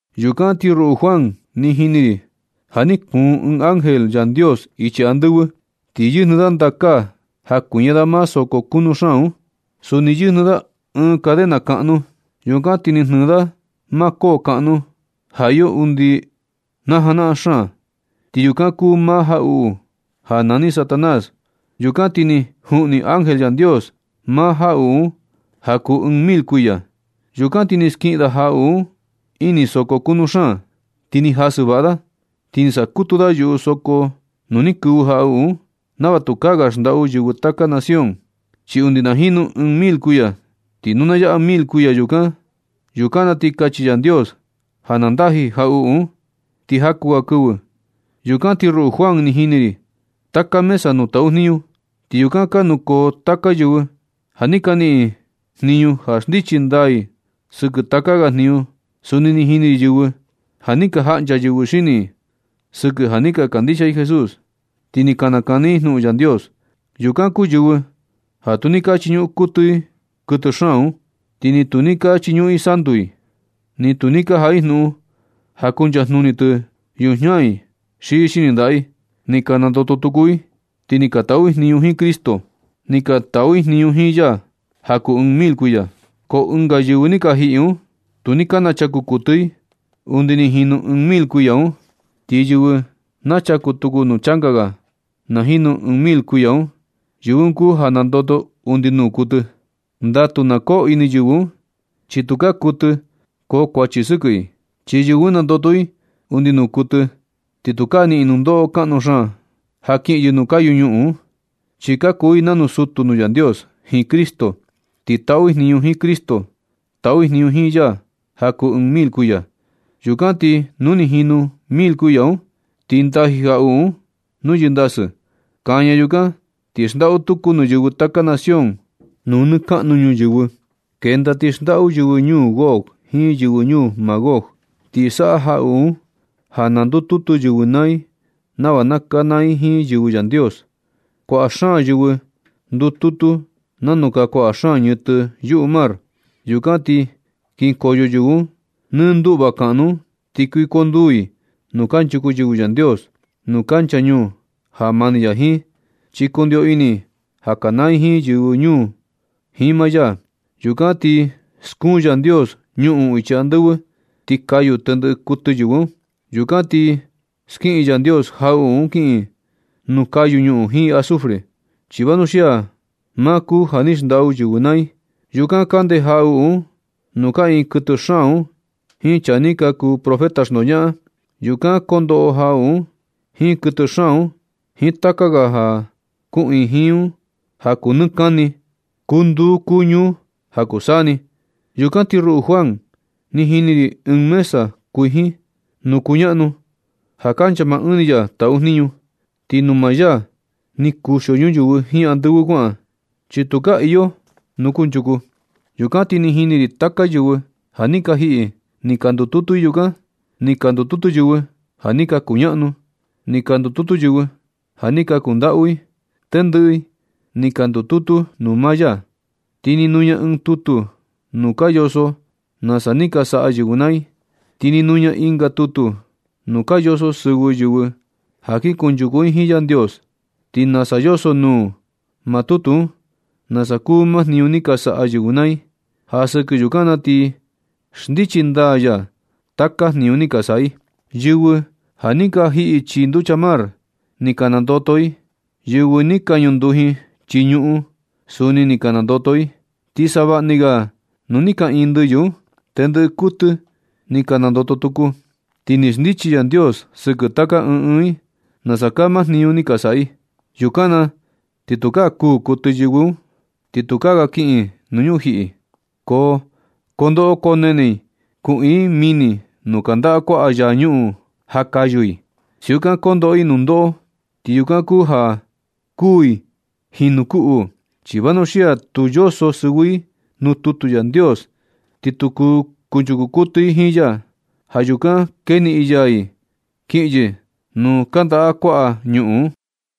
Yukan ti ruꞌu Juan, ni jini ri ja ni kuun ɨɨn ángel Yandios ichi andɨvɨ. Ti yɨjnɨ da ndakaa ja kuiña da maa soko kunu xaan un. Suni yɨjnɨ da ɨɨn cadena kaꞌnu. Yukan ti ni jnɨɨ da maa koo kaꞌnu ja iyo undi najanaꞌan xaan. Ti yukan kuu ma jaꞌuꞌu ja nani Satanás. Yukan ti ni juꞌni ángel Yandios maa jaꞌuꞌu un ja kuu ɨɨn mil kuiya. Yukan ti ni skiꞌin da jaꞌuꞌu un ini ɨɨn soko kunu xaan. Ti ni jasɨ vaꞌa da, ti ni saꞌa kutu da yuꞌu soko nuu ni kɨvɨ jaꞌuꞌu un, nava tukaa ga xndaꞌu yɨvɨ taka nación, chi undi na jinu ɨɨn mil kuiya. Ti nu na yaꞌa mil kuiya, yukan na ti kachi Yandios ja na ndaji jaꞌuꞌu un, ti jaku ga kɨvɨ. Yukan ti ruꞌu Juan, ni jini ri taka mesa nuu taꞌu jniñu. Ti yukan ka nukoo taka yɨvɨ ja ni niꞌin i jniñu ja xndichi ndaa i sɨkɨ taka ga jniñu. Suni ni jini ri yɨvɨ ja ni ka jaꞌncha yɨvɨ xini i sɨkɨ ja ni ka kandixia i Jesús, ti ni ka nakani i jnuꞌun Yandios. Yukan kuu yɨvɨ ja tu ni ka chiñuꞌun kuɨtɨ i kuɨtɨ xaan un. Ti ni tu ni ka chiñuꞌun i santu tɨ. Ni tu ni ka jaꞌa i jnuꞌun ja kuncha jnuni tɨ yujiña i xi xini ndaꞌa i. Ni ka nandoto tuku i, ti ni ka taꞌu i jniñu jiin Cristo. Ni ka taꞌu i jniñu jiin ya ja kuu ɨɨn mil kuiya. Ko ɨnga yɨvɨ ni ka jiꞌi un, tu ni ka nachaku kuɨtɨ i undi ni jinu ɨɨn mil kuiya un. Ti yɨvɨ nachaku tuku nuu changa ga na jinu ɨɨn mil kuiya un, yɨvɨ un kuu ja nandoto undi nuu kuɨtɨ. Ndatu na koo ini yɨvɨ un, chi tukaa kuɨtɨ koo kuachi sɨkɨ i. Chi yɨvɨ un nandoto i undi nuu kuɨtɨ, ti tukaa niꞌin i nundoꞌo kaꞌnu xaan ja kiꞌin yɨ nuu kayu ñuꞌun un. Chi ka kuu i nanu sutu nuu Yandios jiin Cristo. Ti taꞌu i jniñu jiin Cristo. Taꞌu i jniñu jiin ya ja kuu ɨɨn mil kuiya. Yukan ti nu ni jinu mil kuiya un, ti ndaji jaꞌuꞌu un nuu yɨndasɨ. Kaña yukan ti xndaꞌu tuku nuu yɨvɨ taka nación nuu nɨ kaꞌnu ñuyɨvɨ. Kenda ti xndaꞌu yɨvɨ ñuu Gog jiin yɨvɨ ñuu Magog. Ti saꞌa jaꞌuꞌu un ja na ndututu yɨvɨ naa i nava na kanaa i jiin yɨvɨ Yandios. Kuaꞌa xaan yɨvɨ ndututu nanu kaa kuaꞌa xaan ñɨtɨ yuꞌu mar. Yukan ti kinkoyo yɨvɨ un nɨ nduꞌva kaꞌnu un, ti kuikonduu i nuu kanchuku yɨvɨ Yandios, nuu kancha ñuu ja mani ya jiin, chi kundio ini i ja kanaa i jiin yɨvɨ ñuu un jiin maa ya. Yukan ti skuun Yandios ñuꞌun ichi andɨvɨ, ti kayu tendɨꞌɨ kuɨtɨ yɨvɨ un. Yukan ti skiꞌin Yandios jaꞌuꞌu un kiꞌin nuu kayu ñuꞌun jiin azufre, chi vanuxia maa kuu ja ni xndaꞌu yɨvɨ naa i. Yukan kande jaꞌuꞌu un nuu kaꞌiin kuɨtɨ xaan un jiin chaa ni ka kuu profeta xndoñaꞌan. Yukan kondoꞌo jaꞌuꞌu un jiin kuɨtɨ xaan un jiin taka ga ja kuꞌiin jiin un ja kuu nɨ kani, kuu nduu kuu ñuu ja kuu saa ni. Yukan ti ruꞌu Juan, ni jini ri ɨɨn mesa kuijin nuu kuñaꞌnu, ja kancha maa Ɨɨn ya taꞌu jniñu. Ti nuu maa ya ni kuxio ñuyɨvɨ jiin andɨvɨ kuaꞌan, chi tukaa iyo nuu kunchuku. Yukan ti ni jini ri taka yɨvɨ ja ni ka jiꞌi, ni ka ndututu i yukan. Ni ka ndututu yɨvɨ ja ni ka kuñaꞌnu. Ni ka ndututu yɨvɨ ja ni ka kundaꞌu i. Tendɨꞌɨ i ni ka ndututu nuu maa ya. Ti ni nuña ɨɨn tutu nuu ka yoso nasa ni ka saꞌa yɨvɨ naa i. Ti ni nuña ɨnga tutu nuu ka yoso sɨvɨ yɨvɨ ja kin kunchuku i jiin Yandios. Ti nasa yoso nuu maa tutu un, nasa kuu maa jniñu ni ka saꞌa yɨvɨ naa i, ja sɨkɨ yukan na ti xndichi ndaa ya taka jniñu ni ka saꞌa i. Yɨvɨ ja ni ka jiꞌi chii nducha mar, ni ka nandoto i. Yɨvɨ ni ka ñunduji chii ñuꞌun, suni ni ka nandoto i. Ti savaꞌni ga nuu ni kaꞌiin ndɨyɨ un, tendɨꞌɨ kuɨtɨ i ni ka nandoto tuku. Ti ni xndichi Yandios sɨkɨ taka ɨɨn ɨɨn nasa kaa maa jniñu ni ka saꞌa i. Yukan na ti tukaa kuū kuɨtɨ yɨvɨ un, ni tukaa ga ka kiꞌin i nuu ñujiꞌi. Ko koo ndoꞌo koo nene i kuꞌiin ɨɨn mini nuu kandaꞌa kuaꞌa yaa ñuꞌun ja kayu i. Siukan kondoꞌo i nundoꞌo, ti yukan kuu ja kuū i jinu kuu uu. Chi vanuxia tu yoso sɨvɨ i nuu tutu Yandios, ti tu kunchuku kuɨtɨ i jiin ya. Ja yukan keniꞌin ya i kiꞌin yɨ nuu kandaꞌa kuaꞌa ñuꞌun un.